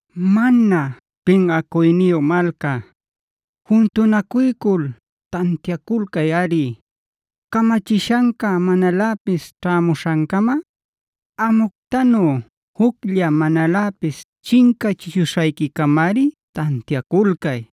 Mana pinꞌacuyniyu malca, juntunacuycul tantiaculcayꞌari. Camachishanca manaläpis ćhämuśhancama, amuctanu juclla manaläpis chincachishuśhayquicamari tantiaculcay.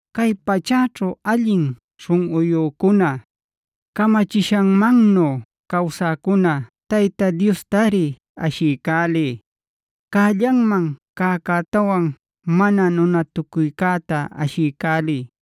Cay pachäćhu allin śhunꞌuyücuna, camachishanmannu cawsäcuna Tayta Diostari ashiycäliy. Cällanman cäcätawan mana nunatucuycäta ashiycäliy.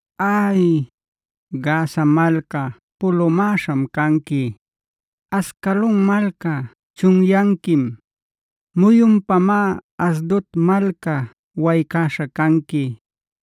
Ay, Gaza malca pulumäśham canqui; Ascalon malca chunyanquim. Muyunpamá Asdod malca waycäśha canqui;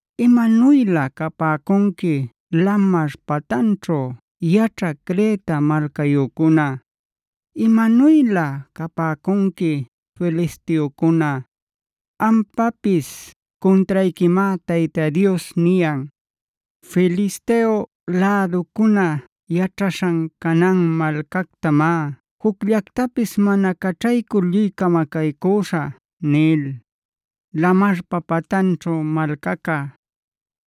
¡Imanuylä capäcunqui lamar patanćhu yaćhä Creta malcayücuna! ¡Imanuylä capäcunqui filisteocuna! Ampapis cuntrayquimá Tayta Dios niyan: “Filisteo läducuna yaćhaśhan Canaan malcactamá jucllactapis mana caćhaycul lluy camacaycüśhä” nil. Lamarpa patanćhu malcaca,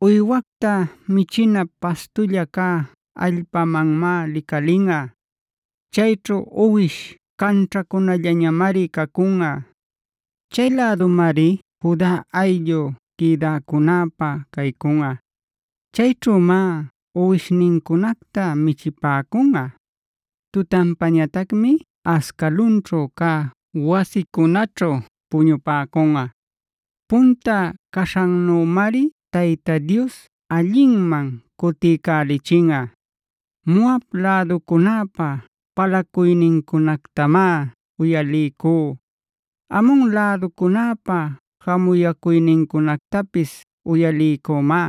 uywacta michinä pastulla cä allpamanmá licalinꞌa. Chayćhu uwish canćhacunallañamari cacunꞌa. Chay lädumari Juda ayllu quïdäcunäpä caycunꞌa. Chayćhümá uwishnincunacta michipäcunꞌa; tutanpañatacmi Ascalonćhu cä wasicunäćhu puñupäcunꞌa. Punta caśhanmannümari Tayta Dios allinman cutiycälichinꞌa. Moab läducunäpa palacuynincunactamá uyaliycú;d Amon läducunäpa jamuyäcuynincunactapis uyaliycümá.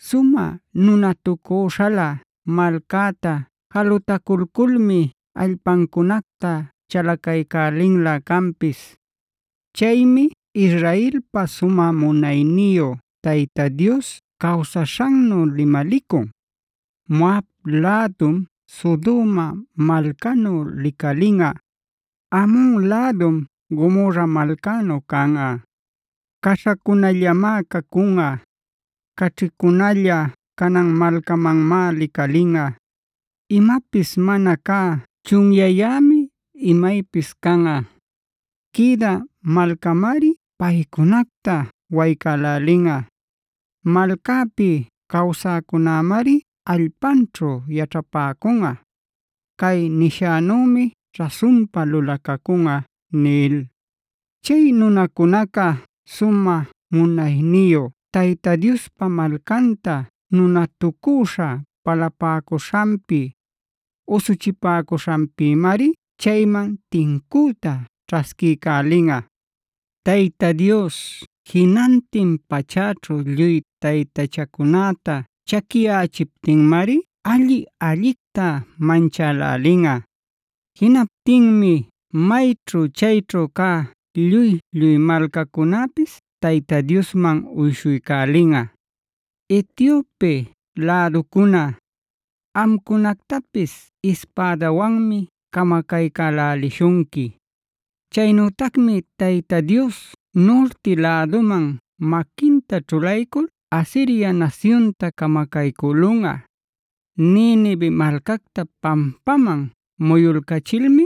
Sumä nunatucüśhalä malcäta jalutaculculmi allpancunacta chalacaycälinlä canpis. Chaymi Israelpa sumä munayniyu Tayta Dios cawsaśhannu limalicun: “Moab lädum Sodoma malcanu licalinꞌa; Amon lädum Gomorra malcanu canꞌa.e Caśhacunallamá cacunꞌa, caćhicunalla canan malcamanmá licalinꞌa, imapis mana cä chunyayämi imaypis canꞌa. Quïdä malcämari paycunacta waycälälinꞌa; malcäpi cawsäcunämari allpanćhu yaćhapäcunꞌa. Cay nishänümi rasunpa lulacacunꞌa” nil. Chay nunacunaca sumä munayniyu Tayta Diospa malcanta nunatucüśha palapäcuśhanpi, usuchipäcuśhanpïmari chayman tincüta ćhasquiycälinꞌa. Tayta Dios jinantin pachäćhu lluy taytachacunäta chaquiyächiptinmari alli-allicta manchälälinꞌa. Jinaptinmi mayćhu chayćhu cä lluy-lluy malcacunäpis Tayta Diosman uyshuycälinꞌa. Etiopef läducuna,g amcunactapis ispädawanmi camacaycälälishunqui. Chaynütacmi Tayta Dios nurti läduman maquinta ćhulaycul Asiria nasyunta camacaycülunꞌa.h Ninive malcacta pampaman muyulcachilmi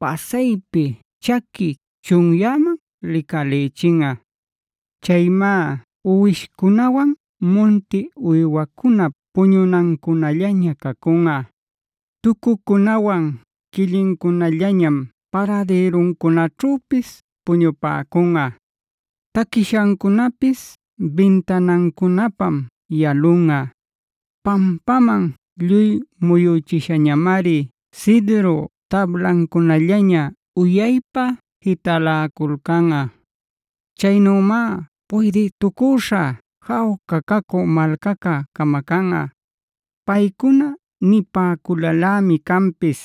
pasaypi chaqui chunyäman licalïchinꞌa. Chaymá uwishcunawan munti uywacunap puñunancunallaña cacunꞌa. Tucucunawan quillincunallañam paradïruncunaćhüpis puñupäcunꞌa; taquishancunapis bintanancunapam yalunꞌa. Pampaman lluy muyüchishañamari cidru tablancunallaña uyaypa jitaläculcanꞌa. Caynümá puydïtucüśha jawca cacü malcaca camacanꞌa. Paycuna nipäculalämi canpis: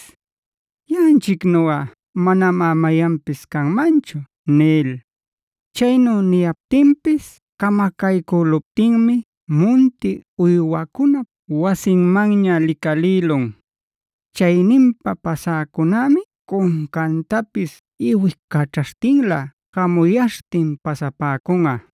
“Yaꞌanchicnuꞌa manamá mayanpis canmanchu” nil. Chaynu niyaptinpis camacaycüluptinmi munti uywacunap wasinmanña licalïlun. Chayninpa pasäcunämi cuncantapis iwicaćhaśhtinlä jamuyaśhtin pasapäcunꞌa.